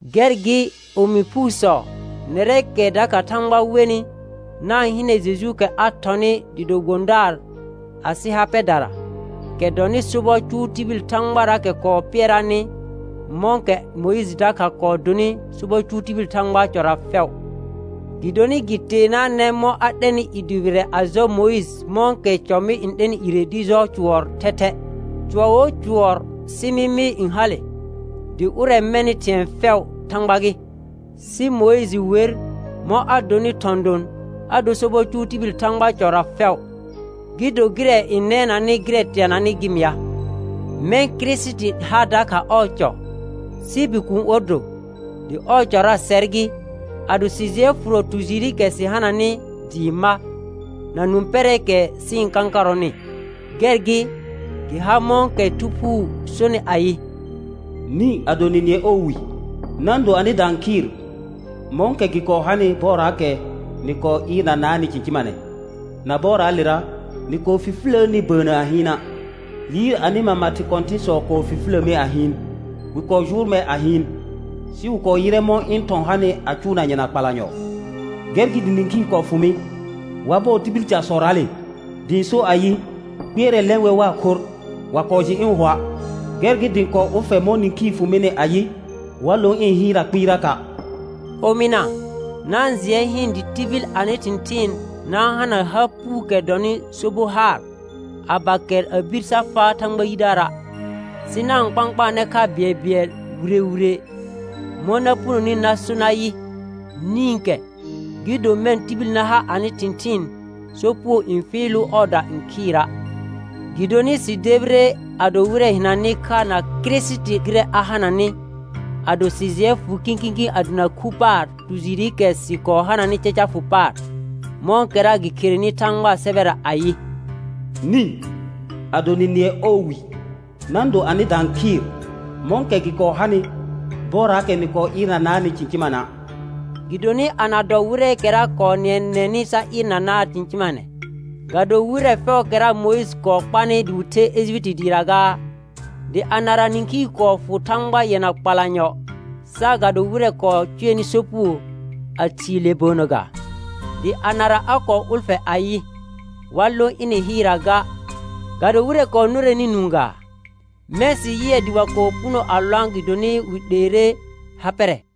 Gɛr gɩ, omi phuusɔ, nɛrɛɛkɛ dakha Thãgba wenɩ, na-n hɩnɛ Jejuukɛ a thɔnɩ dɩ do gbõdaar asɩ ha pɛdara, kɛ dɔnɩ sobɔ cʋʋ tibil Thãgbaraakɛ kɔɔ pɩɛraanɩ mɔ̃kɛ Mʋɩjɩ dakha kɔɔ donɩ sobɔ cʋʋ tibil Thãgbaa cɔra fɛʋ. Gɩdonɩ gɩ teenaanɛ mɔ̃ a 'lɛnɩ i dʋbɩrɛ a jɔ Mʋɩjɩ mɔ̃kɛ cɔ mɩ n 'lɛnɩ ire dɩ jɔ cʋɔr thɛthɛ. Cʋɔr wo cʋɔr sɩ mɩmɩ n hale, dɩ ʋrɛ mɛnɩ thɩ̃ɛ fɛʋ Thãgba gɩ. Sɩ Mʋɩjɩ wer mɔ̃ a donɩ thɔ̃ don, a dor sobɔ cʋʋ tibil Thãgbaa cɔra fɛʋ, gɩ do gɩrɛ n nɛnanɩ gɩrɛ teananɩ gɩ mɩa. Mɛ̃ Kirisiti ha dakha ɔɔ cɔ, sɩ Bikuun or do; dɩ ɔɔ cɔra sɛr gɩ, ado sɩ jɩɛ fʋrɔ tu jɩɩrɩkɛ sɩ hananɩ dɩɩ ma, na nũ pɛrɛɛkɛ sɩ-n kãkarɔnɩ. Gɛr gɩ, gɩ har mɔ̃kɛ Thu Phuu sonɩ ayɩ: «Nĩ, ado nɩ nɩɛ ɔɔ wi, na-n do anɩda n khɩɩr mɔ̃kɛ gɩ kɔɔ hanɩ bɔɔraakɛ nɩ kɔɔ ɩɩrnanaanɩ cɩ̃cɩmanɛ, na bɔɔraalera nɩ kɔɔ fifiləəni bəənnə a hɩɩna'. Liir anɩ mama thɩ kɔ̃tɩ̃sɔ kɔɔ fifilə mi a hɩɩn, wɩ kɔɔ jʋʋr mer a hɩɩn, sɩ wɩ kɔɔ yɩrɛ mɔ̃ ɩ̃ thɔ̃ hanɩ a cʋʋna yɛna kpalanyɔ. Gɛr gɩ dɩ nĩkhii kɔɔ fʋ mɩ wa bɔɔ tibil casɔraale, dɩ ɩ̃ so ayɩ: Kpɩɛrɛ lɛ̃ wɛr waa khorr; wa kɔɔ jɩ ɩ̃ hʋa'. Gɛr gɩ dɩ ɩ̃ kɔɔ ʋlfɛ mɔ̃ nĩkhii fʋ mɩnɩ ayɩ: Wa lõ ĩ hɩɩrra kpɩɩraka'.» Omɩna, na-n jɩɛ hɩɩn dɩ tibil anɩ thɩ̃thɩɩn na-n hana ha puukɛ dɔnɩ so bo haar, a ba kɛr a bir sa faa Thãgba yidaara'. Sɩ na-n kpãkpaanɛ kha bɩɛlbɩɛl wire wire, mɔ̃ na punoni na so nayɩ: «Nĩkɛ», gɩ do mɛ̃ tibil na ha anɩ thɩ̃thɩɩn sopugo n fɩɩlʋʋ ɔɔda n khɩɩra'. Gɩdonɩ sɩ debire a do wɩrɛ hɩnanɩ kha na Kirisiti gɩrɛ a hananɩ, ado sɩ jɩɛ fʋ kĩkĩ a dana khu paar tu jɩɩrɩkɛ sɩ kɔɔ hananɩ caca fʋ paar, mɔ̃kɛra gɩ kherenɩ Thãgbaa sɛbɛra ayɩ: «Nĩ, ado nɩ nɩɛ ɔɔ wi, na-n do anɩda n khɩɩr mɔ̃kɛ gɩ kɔɔ hanɩ bɔɔraakɛ nɩ kɔɔ ɩɩrnanaanɩ cɩ̃cɩmana'.» Gɩdonɩ ana dɔ wɩrɛɛkɛra kɔɔ nɩɛnɛnɩ sa ɩɩrnanaa cɩ̃cɩmanɛ? Ga do wɩrɛ fɛʋʋkɛra Mʋɩjɩ kɔɔ kpanɩ dɩ wɩ the Ejipiti dɩɩra gaa? Dɩ anara nĩkhii kɔɔ fʋ Thãgba yɛna kpalanyɔ saagado wɩrɛ kɔɔ cʋɛnɩ sopugo a thii le bəənnə ga? Dɩ anara a kɔɔ ʋlfɛ ayɩ, wa lõ ɩnɩ hɩɩrra ga, ga do wɩrɛ kɔɔ nʋrɛnɩ nũu gaa? Mɛ̃ sɩ yɩɛ dɩ wa kɔɔ puno a lõa' gɩdonɩ wɩ 'leere ha pɛrɛ.